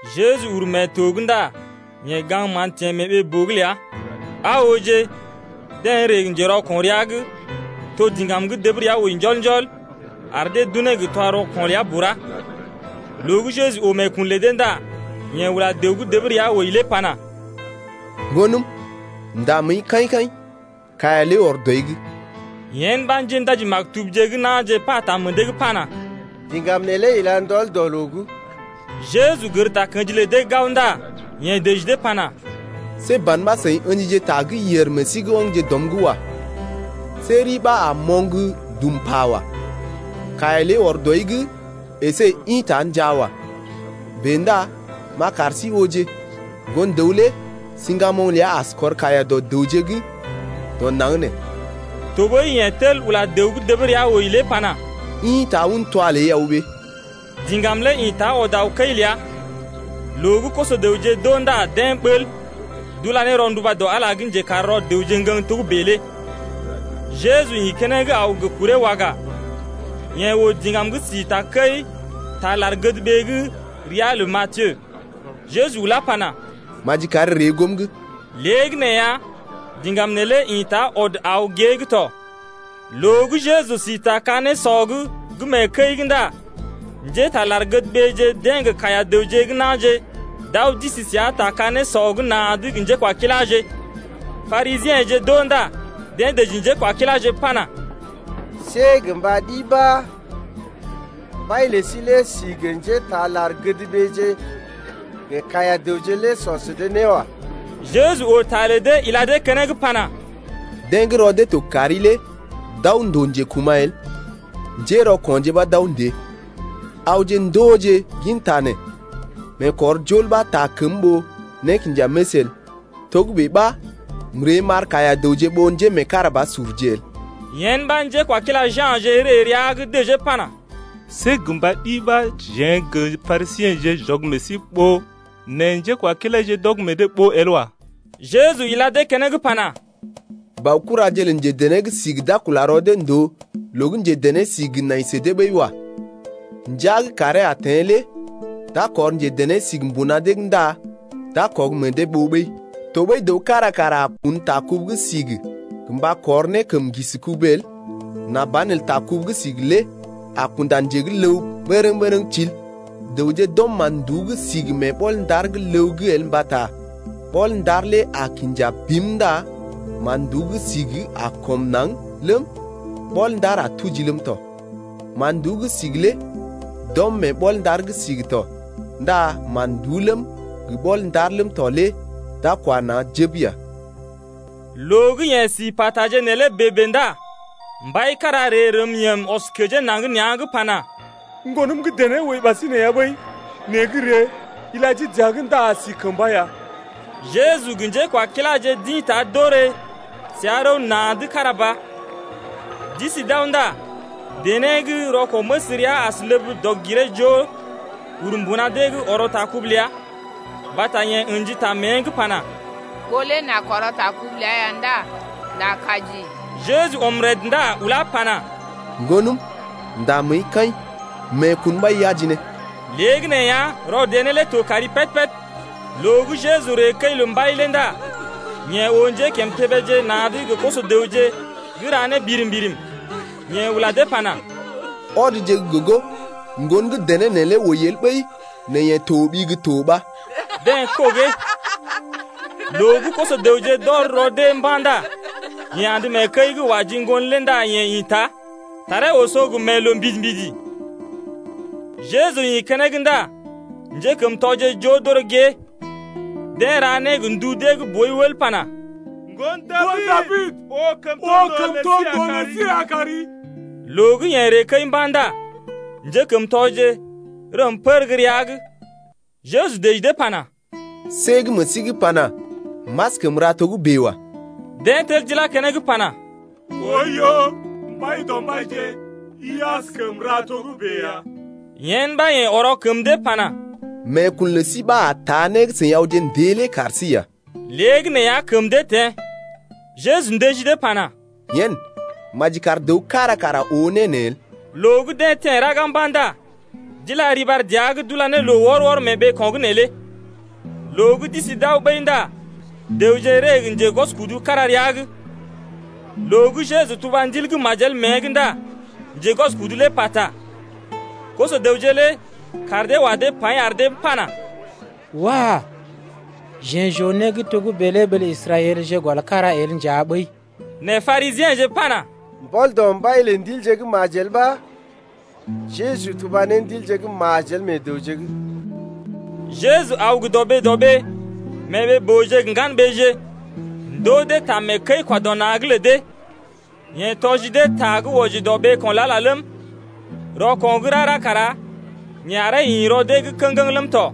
Jeju uru mee to’g ndá yeḛ gaŋg mán teḛ mee ɓee-boo’g ləa. Aa ooje, deḛ ree gə njerɔko̰ rəa’g, to diŋgam gə́ dəb rəa wəi wɔ, ar dee d’unee gə twa-rɔko̰ ləa bura. Loo gə́ Jeju oo meekun lə dee ndá yeḛ ula dəw gə́ dəb rəa wəi lé pana: Ŋgonəm, nda məəi kaḭ-kaḭ, kaiya ləi ɔr dɔi’g. Yen ɓa njéndaji-maktubje gə́ na̰je pata meḛ dee’g pana: Diŋgam neelé ila ndɔl dɔ loo’g. Jeju gər takə̰ji lə dee gao ndá yeḛ dəji dee pana: See ban ɓa seḭ ə̰jije ta gə́ yèr meḛ sí’g, ɔmje dɔm’g wa. See ri ɓa a moŋg dum pa wa. Kaiya ləi ɔr dɔi’g, əsé ḭta njaa wa. Bèe ndá m’a kar sí ooje, Ŋgon-dəw lé siŋgamoŋ ləa as kɔr kaiya dɔ dəwje gə́ dɔ naŋg nee. Tɔɓəi yeḛ tel ula dəw gə́ dəb rəa wəi lé pana: Ḭta un twa ləi aw ɓée. Diŋgam lé ḭta ɔd aw kəi ləa. Loo gə́ koso-dəwje d’oo ndá deḛ ɓəl, d’ula ne rɔnduba dɔ Ala gə́ njekar rɔ dəwje ŋgəŋ togə́bè lé. Jeju ḭ keneŋ aw gə kuree waga, yeḛ oo diŋgam gə́ si takəi taa lar-gədɓee’g ria lə Matiyo. Jeju ulá pana: Maji kari ree goom’g. Léegəneeya, diŋgam neelé ḭta ɔd aw gée’g tɔ. Loo gə́ Jeju si ta ka-nésɔ’g gə́ mee kəi’g ndá njétaa lar-gədɓeeje deḛ gə kaiya-dəwje gə́ na̰je d’aw d’isi səa ta ka-nésɔ’g na̰’d gə njékwakiláje. Parisiḛje d’oo ndá deḛ dəji njékwakiláje pana: See gə mba ɗi ɓa mbai lə sí lé si gə njétaa lar-gədɓeeje gə kaiya-dəwje lé sɔ sə dee né wa. Jeju oo ta lə dee ila dee keneŋ pana: Deḛ gə́ rɔ dee to kari lé d’aw ndòo njekuma̰ el, njérɔko̰je ɓa d’aw ndée. Awje ndooje ginta nee: Meekɔrjol ɓa taa kəm ɓó nékinjaməs el. Togə́bè ɓa m’ree m’ɓar kaiya-dəwje ɓó njémeekarabasurje el. Yen ɓa njekwakila Jasee ree rəa’g dəjee pana: See gə mba ɗi ɓa jeḛ gə Parisiḛje j’ɔg meḛ sí ɓoo nɛ njékwakilaije d’ɔg meḛ dee ɓoo el wa. Jeju ila dee keneŋ pana: Baokuraje lə njedené-sigi lé see d’a kula rɔ dee ndòo loo gə́ njedené-sigi nai sə dee ɓəi wa. Ndəa gə́ kàree a teḛ lé d’a kɔr njedené-sigi mbuna dee’g ndá d’a kɔg meḛ dee ɓoo ɓəi. Tɔɓəi dəw kára kara a kun ta kubu gə́ sigi gə mba kɔr ne kəm ŋgisi kubu el nà banelə ta kubu gə́ sigi lé a kunda nje gə́ ləw bərəŋ-bərəŋ til. Dəwje d’ɔm mán-nduú gə́ sigi mee ɓɔl-ndar gə́ ləw’g el mbata ɓɔl-ndar lé a kinja bim ndá mán-nduú gə́ sigi a kɔm naŋg ləm, ɓɔl-ndar a tuji ləm tɔ. Man-nduú gə́ sigi lé d’ɔm mee ɓɔl-ndar gə́ sigi’g tɔ ndá mán-nduú ləm, gə ɓɔl-ndar ləm tɔ lé d’a kwa naŋg jəb ya. Loo gə́ yeḛ si pa taje neelé bèe-bèe ndá mbai gə́ njekəi-kwa-dɔ-na̰ kára ree rəm yəm ɔs kəjee naŋg nea̰’g pana: Ŋgonəm gə́ dené wəi ɓasinè ya ɓəi. Nɛ gə́ ree, ila jii dəa’g ndá a si kəmba ya. Jeju gə njékwakiláje d’ḭta d’orè səa rəw na̰’d kára ba. D’isi d’aw ndá dené gə́ rɔko̰-məs rəa as ləb dɔg-giree-joo uru mbuna dee’g ɔrɔ ta kubu ləa. Mbata yeḛ ə̰ji ta mée’g pana: Ɓó lé n’a kɔrɔ ta kubu ləa ya ndá n’a kaji. Jeju ɔm rəd ndá ulá pana: Ŋgonəm, ndá məəi kaḭ, meekun ləi taa né ari aji ne ya. Léegəneeya, rɔ dené lé to kari péd-péd. Loo gə́ Jeju ree kəi lə mbai lé ndá yeḛ oo njékimtébéje na̰’d gə koso-dəwje gə́ ra né birim-birim. Yeḛ ula dee pana: Ɔdje gə́ gogo, ŋgon gə́ dené neelé wəi el ɓəi nɛ yeḛ toɓi gə́ to ɓa. Deḛ kɔgee. Loo gə́ koso-dəwje d’ɔr rɔ dee mba̰ ndá yeḛ andə mee kəi’g wa ji ŋgon lé ndá yeḛ ḭta. Taree oso gə mee loo mbidi-mbidi. Jeju ḭ keneŋ ndá njékəmtɔje joo d’oré gée, deḛ ra né gə ndu dee gə́ boi wəl pana: Ŋgon Dabid, oo kəmtondoo lə sí ya kari. Loo gə́ yeḛ ree kəi mba̰ ndá njékəmtɔje rəm pər gə́ rəa’g. Jeju dəji dee pana: See gə́ meḛ sí’g pana: M’askəm ra togə́bè wa. Deḛ tel d’ilá keneŋ pana: Oiyo, Mbaidɔmbaije, i askəm ra togə́bè ya. Yen ɓa yeḛ ɔrɔ kəm dee pana: Meekun lə sí ɓa a taa né gə́ seḭ awje ndée lé kar sí ya. Léegəneeya kəm dee teḛ. Jeju ndəji dee pana: Yen, maji kar dəw kára kara oo né neelé el. Loo gə́ deḛ teḛ raga mba̰ ndá d’ila riɓar dəa’g d’ula ne loo wɔr-wɔr mee ɓeeko̰’g neelé. Loo gə́ d’isi d’aw ɓəi ndá dəwje ree gə njegwɔskudu kára rəa’g. Loo gə́ Jeju tuba ndil gə́ majel mée’g ndá njegwɔskudu lé pata. Koso-dəwje lé kaar dee wa dee paḭ ar dee pana: Wah, jeḛ j’oo né gə́ togə́bè lé ɓee lə Israɛlje gɔl kára el nja ɓəi. Nɛ Parisiḛje pana: Mbɔl dɔ mbai lə ndilje gə́ majel ɓa Jeju tuba ne ndilje gə́ majel meḛ dəwje’g. Jeju aw gə dɔɓee-dɔɓee, mee ɓee-booje gə ŋgan-ɓeeje ndoo dee ta mee kəi-kwa-dɔ-na̰’g lə dee. Yeḛ tɔji dee ta gə́ wɔji dɔ ɓeeko̰ lə Ala lé ləm, rɔko̰ gə́ rara kara yeḛ aree ḭ rɔ dee’g kə̰geŋ ləm tɔ.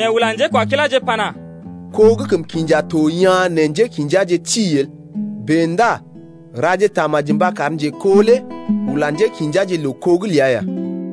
Yeḛ ula njékwakiláje pana: Ko gə́ kəm kinja to yaa̰ nɛ njékḭjaje ti el. Bèe ndá raje tamaji mba kar njeko lé ula njékḭjaje loo-kó’g ləa ya.